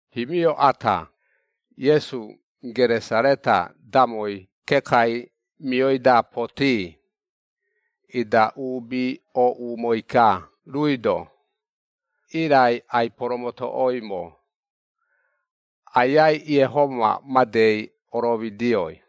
Himio ata, Iesu Geresareta damoi kekai mioi-da potii, ida uubi ooꞌumoi-ka ruui-do, irai ai-poromotoꞌoimo Aiai Iehoma madei, oromidioi.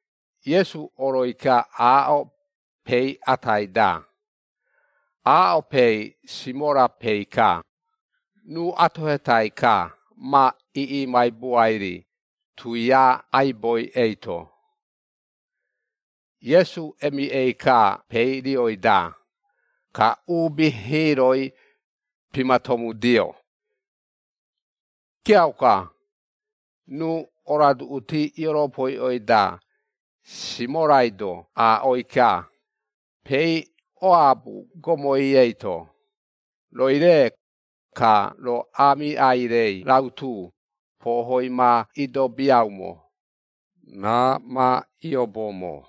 Iesu oroi-ka aaꞌo peei atai-da, aaꞌo peei Simora peei-ka, ruu atohetai-ka, ma iꞌimaibuai-ri tuia aiboi eito. Iesu emiꞌei-ka peei rioi-da, ka uubi hiiroi, pimatomudio. Kiauka, ruu oroaduꞌuti ioropoiꞌoi-da, Simorai-do aaꞌoi-ka, “Peei oabu gomoi eito, rooi-re, ka roo aamiꞌai-rei rautu, pohoi ma idobiaumo, raa ma iobomo.”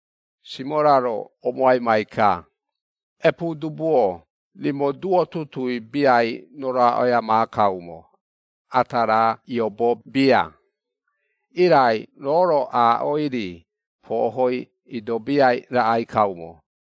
Simora-ro omoaimai-ka, “Epuudubu-o, rimo duo tutuui biai roroaꞌoia maakaumo, ata raa iobo bia. Irai roo-ro aaꞌoi-ri, pohoi idobiai raꞌai kaumo.”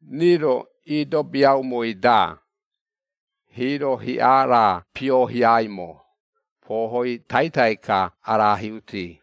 Rii-ro iodobiaumoi-da, hiiro hiꞌa raa piohiaimo, pohoi taitai-ka arahiuti.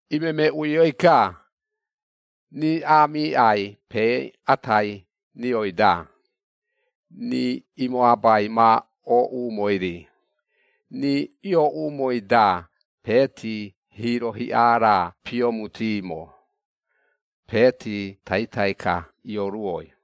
Imemeꞌuioi-ka, rii aamiꞌai pee atai rioi-da, rii imoabai ma ooꞌumoi-ri. Rii iooꞌumoi-da peeti, hiiro hiꞌa raa piomutimo, peeti taitai-ka ioruoi.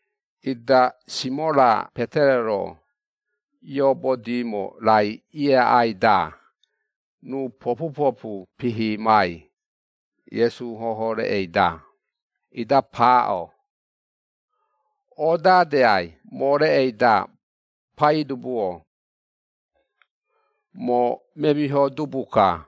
Ida Simora Petero-ro, iobodimo raai ieaꞌai-da, ruu popupopu pihimai, Iesu hohoo reꞌei-da, ida paaꞌo. “Odadeai moo reꞌei-da, Paidubu-o! Moo memiho dubu-ka!”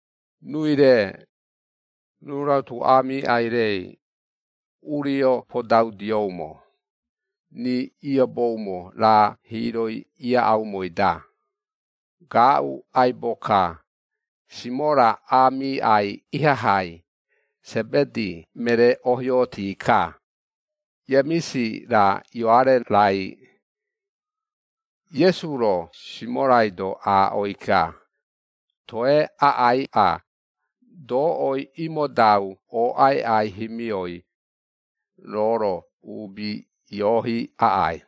Ruui-re, ruu rautu aamiꞌai-rei, urio podaudioumo, rii ioboumo raa hiiroi iaꞌaumoi-da. Gaaꞌu aibo-ka, Simora aamiꞌai ihahai, Sebedi meree ohiooti-ka, Iemisi-ra Ioare-rai. Iesu-ro Simorai-do aaꞌoi-ka, “Toe aꞌaiꞌa, doꞌoi imodau ooꞌaiꞌai himioi, roo-ro uubi iohi aꞌai.”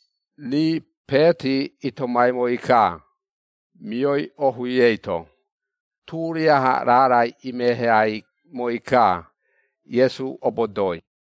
Rii peeti itomaimoi-ka, mioi ohui eito, turiaha raarai imeheaimoi-ka, Iesu obodooi.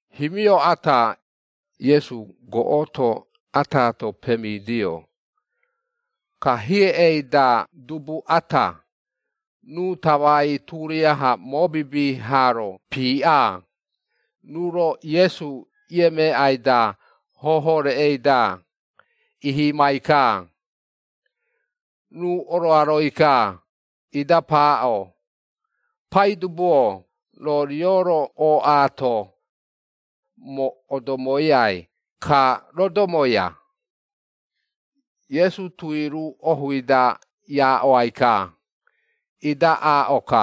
Himio ata, Iesu goꞌoto ataato pemidio, ka hiei-da dubu ata, ruu tamai turiaha mobibi haaro piiꞌa, ruu-ro Iesu iemeeꞌai-da hohoo reꞌei-da ihimai-ka. Ruu oroaroi-ka, ida paaꞌo, “Paidubu-o, roo rio-ro ooꞌaato, moo odomoiai ka rodomoia.” Iesu tui ruu ohui-da iaaꞌoai-ka, ida aaꞌo-ka,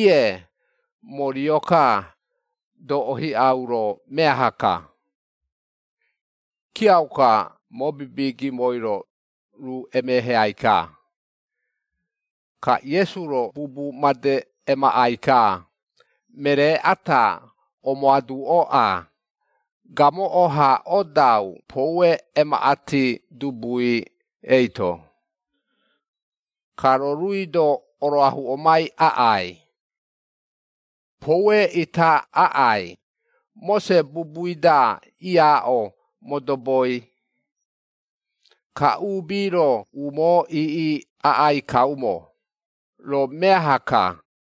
“Iee, moo rio-ka, doꞌo hiꞌau roo meaha-ka.” Kiauka mobibi gimoi-ro, ruu emeheai-ka. Ka Iesu-ro bubu made emaꞌai-ka, “Meree ata omoaduꞌoꞌa, gamoꞌo-ha odau poue emaꞌati dubui eito. Ka roo ruui-do oroahuꞌomai aꞌai. Poue ita aꞌai, Mose bubui-da, iaaꞌo modoboi. Ka uubi-ro umoo iiꞌi aꞌai kaumo, roo meaha-ka.”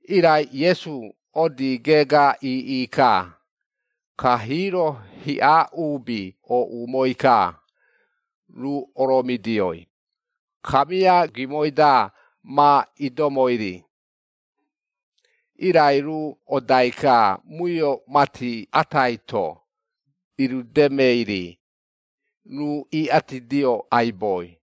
Irai Iesu odii geega iiꞌi-ka, ka hiiro hiꞌa uubi ooꞌumoi-ka, ruu oromidioi, kamia gimoi-da ma idomoi-ri. Irai ruu odai-ka muio mati atai-to, irudemei-ri, ruu iꞌatidio aiboi.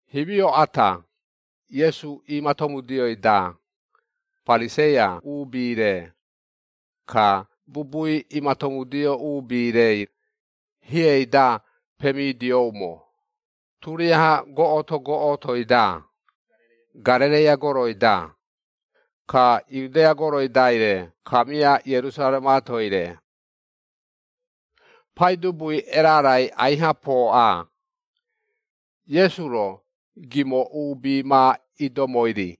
Himio ata, Iesu iimatomudioi-da, Pariseia uubi-re, ka bubui imatomudio uubi-rei, hiei-da pemidioumo, ioꞌumo uubi turiaha goꞌoto goꞌotoi-da Garereia goroi-da, ka Iudea goroi-daire, kamia Ierusaremaatoi-re. Paidubui erarai aiha pooꞌa, Iesu-ro, gimo uubi ma idomoi-ri.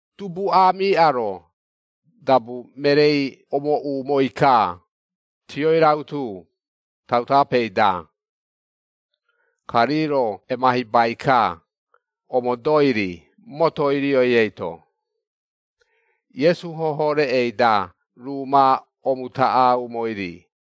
Dubu aamiꞌa-ro, dabu mereei omooꞌumoi-ka, tioi rautu, tautapei-da, ka rii-ro emahibai-ka, omodoi-ri motoi rioi eito, Iesu hohoo reꞌei-da, ruu ma omutaꞌaumoi-ri.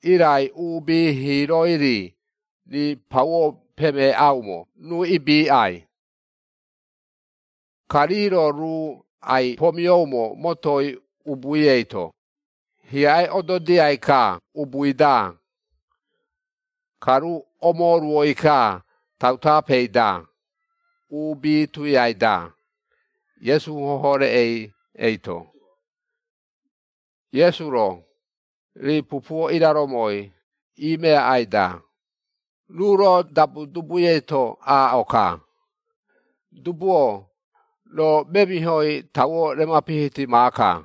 Irai uubi hiiroi-ri, rii pauo pemeeꞌaumo ruu ibiiꞌai. Ka rii-ro ruu ai-pomioumo motoi ubui eito, hiaꞌe ododiai-ka ubui-da. Ka ruu omooruoi-ka tautapei-da, uubi tuiai-da, Iesu hoho reꞌei eito. Iesu-ro, rii pupuo iraromoi iimeaꞌai-da, ruu-ro dabu dubui eito aaꞌo-ka, “Dubu-o, roo memihoi tauo remapihiti maaka.”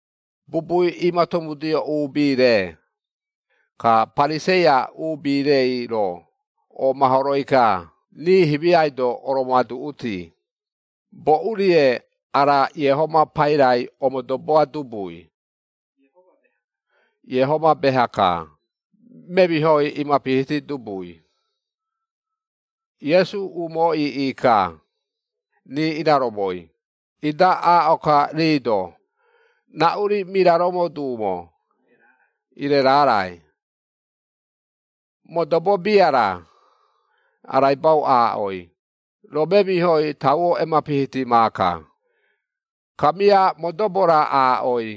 Bubui imatomudio uubi-re, ka Pariseia uubi-reiro oomahoroi-ka rii himiai-do oromoaduꞌuti, “Boꞌu-rie ara Iehoma pairai omodoboa dubui? Iehoma beha-ka, memihoi imapihiti dubui.” Iesu umoo iiꞌi-ka, rii iraromoi, ida aaꞌo-ka rii-do, “Raꞌu-ri miraromo duumo, ire raarai? Modobo bia-ra, araibau aaꞌoi, ‘Roo memihoi tauo emapihiti maaka,’ kamia modobo-ra aaꞌoi,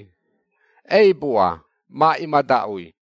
‘Eibua, ma imadaꞌui.’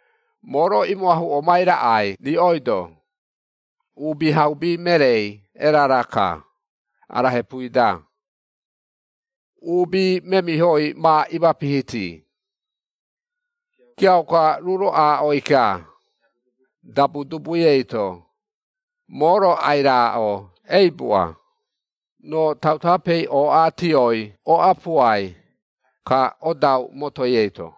Moo-ro imoahuꞌomai raꞌai riꞌoi-do, Uubihaubi mereei erara-ka, ara hepui-da, uubi memihoi ma imapihiti.” Kiauka ruu-ro aaꞌoi-ka dabu dubui eito, “Moo-ro ai-raaꞌo, eibua, roo tautapei ooꞌa tioi oꞌapuai, ka odau motoi eito.”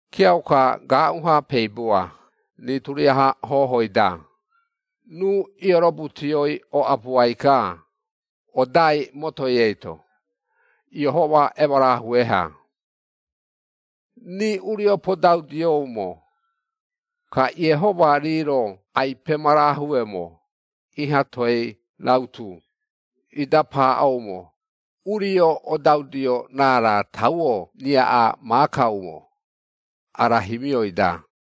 Kiauka gaaꞌu-ha peibua rii turiaha hohoi-da, ruu iorobu tioi oꞌapuai-ka, odai motoi eito, Iehoma emarahue-ha. Rii urio podaudioumo, ka Iehoma rii-ro ai-pemarahueumo iha toei rautu, ida paaꞌoumo, “Urio odaudio raara tauo riaꞌa maakaumo, ara himioi-da!”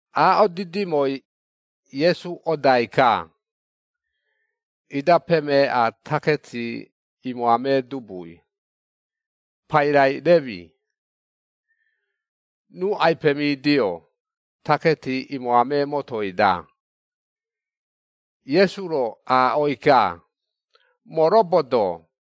Aaꞌo didimoi, Iesu odai-ka. Ida pemeeꞌa taketi imoamee dubui, pairai Remi, ruu ai-pemidio, taketi imoamee motoi-da. Iesu-ro aaꞌoi-ka, “Moo robodoo.”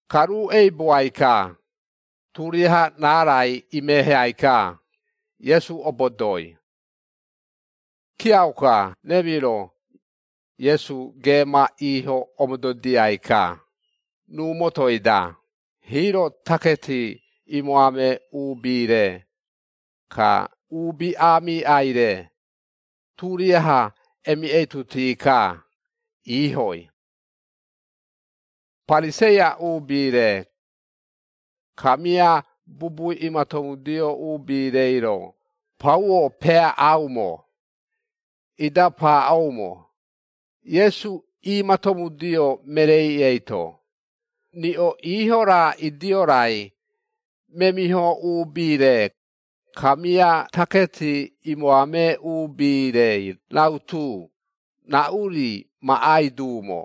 Ka ruu eibuai-ka, turiaha raarai imeheai-ka, Iesu obodoi. Kiauka Remi-ro, Iesu geema iiho omododiai-ka, ruu motoi-da, hiiro taketi imoamee uubi-re, ka uubi aamiꞌai-re, turiaha emiꞌeituti-ka iihoi. Pariseia uubi-re, kamia bubui imatomudio uubi-reiro, pauo peaꞌaumo, ida paaꞌoumo, Iesu iimatomudio mereei eito, “Riꞌo iiho-ra idio-rai, memiho uubi-re, kamia taketi imoamee uubi-rei rautu, raꞌu-ri maꞌai duumo?”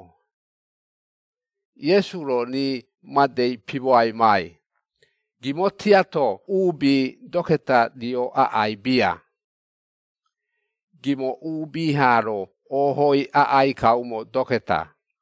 Iesu-ro rii madei pimoaimai, “Gimo tiato uubi doketa rio aꞌai bia. Gimo uubi haa-ro oohoi aꞌai kaumo doketa.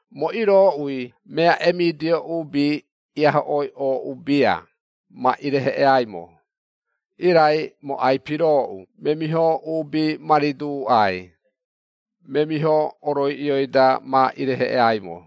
Moo irooꞌui mea emidio uubi iahoꞌoi ooꞌu bia ma ireheꞌeaimo, irai moo ai-pirooꞌu memiho uubi ma riduuꞌai, memiho oroiꞌioi-da ma ireheꞌeaimo.”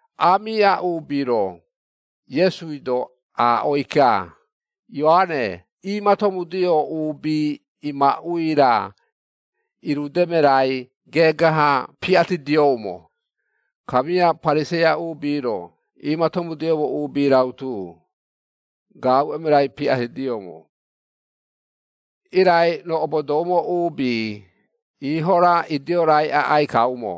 Aamiꞌa uubi-ro, Iesui-do aaꞌoi-ka, “Ioare iimatomudio uubi imaꞌui-ra, iirudeme rai geega-ha piꞌatidioumo, kamia Pariseia uubi-ro uubi iimatomudio uubi rautu, gaaꞌu emerai piꞌatidioumo. Irai roo obodoumo uubi, iiho-ra idio-rai aꞌai kaumo.”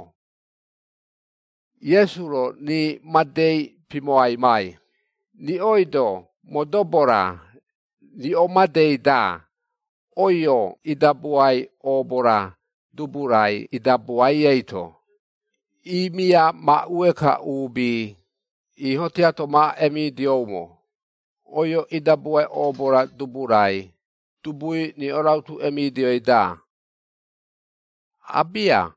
Iesu-ro rii madei pimoaimai, “Riꞌoi-do modobo-ra, riꞌo madei-da, oio idabuai oobo-ra dubu-rai idabuai eito, imiamaꞌue-ka uubi, iiho tiato ma emidioumo, oio idabuai oobo-ra dubu-rai, dubui riꞌo rautu emidioi-da? Abia.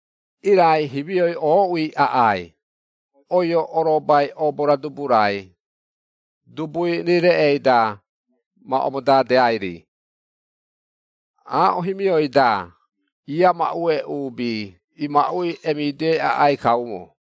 Irai himioi ooꞌui aꞌai, oio orobai oobo-ra dubu-rai, dubui rii reꞌei-da, ma omodadeai-ri. Aaꞌo himioi-da iamaꞌue uubi imaꞌui emidioi aꞌai kaumo.”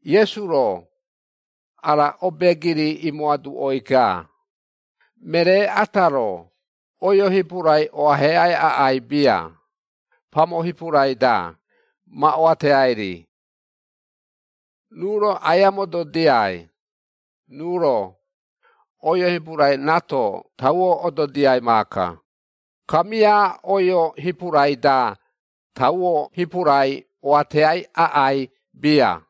Iesu-ro, ara obeegiri imoaduꞌoi-ka, “Meree ata-ro, oio hipurai oaheꞌai aꞌai bia, pamo hipurai-da, ma oateai-ri. Ruu-ro aia mododiai, ruu-ro, oio hipurai raato tauo ododiai maaka, kamia oio hipurai-da, tauo hipurai oateai aꞌai bia.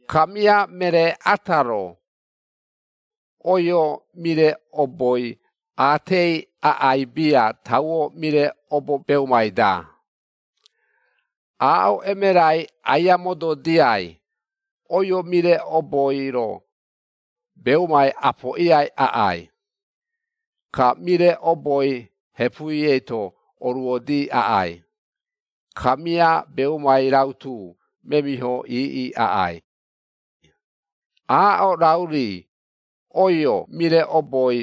Kamia meree ata-ro, oio mire oboi aatei aꞌai bia tauo mire obo beumai-da. Aaꞌo emerai aia mododiai, oio mire oboi-ro, beumai apoꞌiai aꞌai, ka mire oboi hepui eito oruodi aꞌai, kamia beumai rautu memiho iiꞌi aꞌai. Aaꞌo rau-ri, oio mire oboi,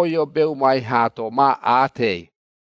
oio beumai haato, ma aatei.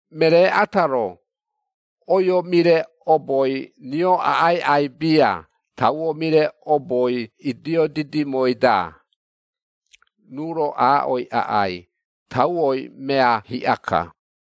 Meree ata-ro, oio mire oboi rio aꞌaiꞌai bia, tauo mire oboi idio didimoi-da. Ruu-ro aaꞌoi aꞌai, ‘Tauoi mea hiꞌa-ka.’”